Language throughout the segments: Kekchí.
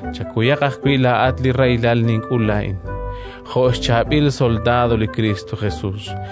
Chakuyaq ajwi' laa'at li rahilal nink'ul laa'in, jo' xchaab'il soldaad li Kristo Jesus.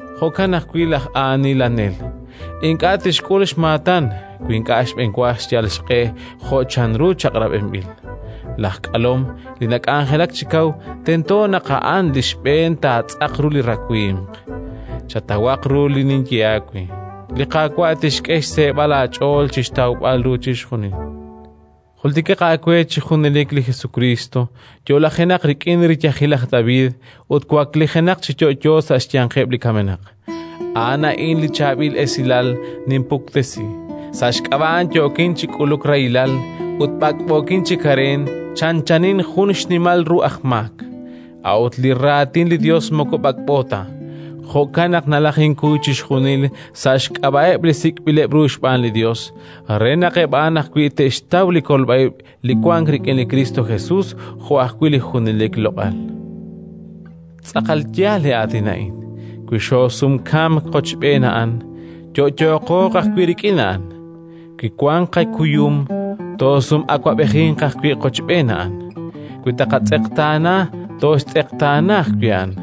Jo'kan ajwi' laj aanilanel: ink'a' tixk'ul xmaatan wi ink'a' xb'enwa xyal xq'e jo' chanru chaq'rab'inb'il. Laj k'alom li nak'anjelak chi kaw tento naq a'an li xb'een taatz'aq ru li rawimq. Chatawaq ru li ninye aawe; li Qaawa' tixk'e xseeb'al aach'ool chi xtawb'al ru chixjunil. Jultikaq aawe chi junelik li Jesukriist, yo'lajenaq rik'in riyajil laj David ut waklijenaq chi yo'yo sa' xyanqeb' li kamenaq: a'an a'in li Chaab'il Esilal ninpuktesi. Sa' xk'ab'a' A'an yookin chi k'uluk rahilal, ut b'ak'b'ookin chi kareen chanchanin jun xnimal ru aj maak. A'ut li Raatin li Yos moko b'ak'b'o ta. Jo'kan naq nalajinkuy chixjunil sa' xk'ab'a'eb' li sik'b'ileb' ru xb'aan li Yos, re naq eb' a'an ajwi' te'xtaw li kolb'a ib' li wank rik'in li Kristo Jesus jo' ajwi' li junelik loq'al. Tz'aqal yaal li aatin a'in: Wi xoosumkamk qochb'een A'an, yo'yooqo ajwi' rik'in A'an. Wi wanq qakuyum, toosum'awab'ejinq ajwi' qochb'een A'an. Wi taaqatz'eqtaana, tooxtz'eqtaana ajwi' A'an.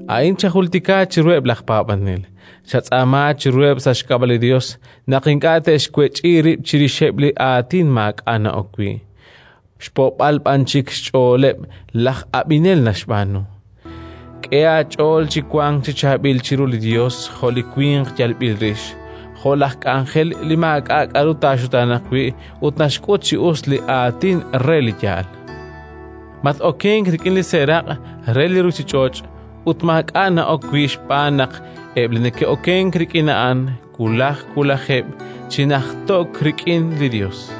A'in chajultika chiruheb' laj paab'anel. Chatz'aama chiruheb' sa' xk'ab'a' li Yos naq ink'a' te'xwech'i rib' chirixeb' li aatin maak'a' na'ok wi', xpo'b'al b'an chik xch'ooleb' laj ab'inel naxb'aanu. K'e aach'ool chi wank chi chaab'il chiru li Yos jo' li winq yalb'il rix, jo' laj k'anjel li maak'a' k'aru taaxutaanaq wi' ut naxk'ut chi us li Aatin re li yaal. Mat-okenk rik'in li seeraq' re li ruuchich'och' ut maak'a' na'ok wi', xb'aan naq eb' li neke'okenk rik'in a'an, wulaj wulajeb' chi najto'k rik'in li Yos,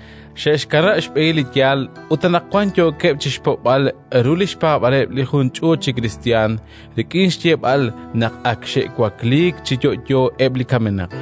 xe'xkanab' xb'ehil li yaal ut anaqwan yookeb' chi xpo'b'al ru li xpaab'aaleb' li jun ch'uut chi kristiyan rik'in xyeeb'al naq ak xe'wakliik chi yo'yo eb' li kamenaq.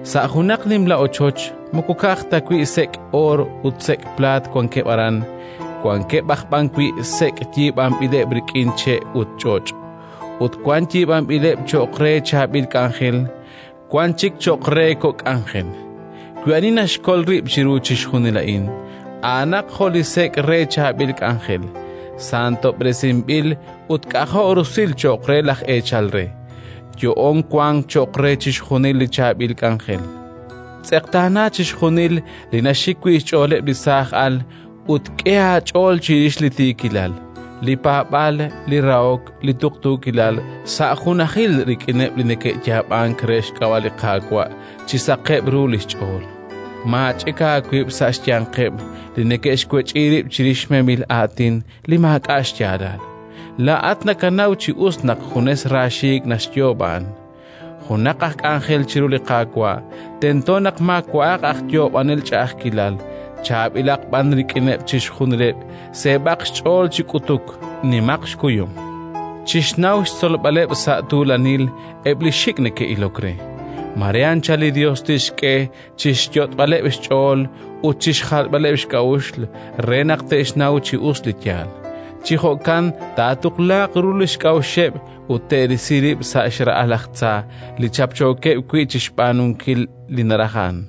Sa' junaq nimla ochoch moko ka'aj ta wi' sek' oor ut sek' plaat wankeb' aran, wankeb' aj b'an wi' sek' yiib'anb'ileb' rik'in che' ut ch'och'; ut wan yiib'anb'ileb' cho'q re chaab'il k'anjel, wan chik cho'q re kok' k'anjel. Wi ani naxkol rib' chiru chixjunil a'in, a'anaq jo' li sek' re chaab'il k'anjel, santob'resinb'il ut k'ajo' rusil cho'q re laj eechal re; yo'oon wank cho'q re chixjunil li chaab'il k'anjel. Tz'eqtaana chixjunil li naxik wi' xch'ooleb' li saaj al ut k'e aach'ool chirix li tiikilal, li paab'aal, li rahok, li tuqtuukilal, sa' junajil rik'ineb' li neke'yaab'ank re xk'ab'a' li Qaawa' chi saqeb' ru li xch'ool. Maach'ik aawib' sa' xyanqeb' li neke'xwech'i rib' chirix memil aatin li maak'a' xyaalal; laa'at nakanaw chi us naq junes raaxiik' naxyoob' a'an. Junaq aj k'anjel chiru li Qaawa' tento naq maawa'aq aj yoob'anel ch'a'ajkilal, chaab'ilaq b'an rik'ineb' chixjunileb', seeb'aq xch'ool chi k'utuk, nimaq xkuyum. Chixnaw xtzolb'aleb' sa' tuulanil eb' li xik' neke'ilok re. Mare anchal li Yos tixk'e chi xyot'b'aleb' xch'ool ut chi xjalb'aleb' xk'a'uxl re naq te'xnaw chi us li yaal. Chi jo'kan taatuqlaaq ru li xk'a'uxeb' ut te'risi rib' sa' li xra'al laj tza li chapchookeb' wi' chi xb'aanunkil li naraj a'an.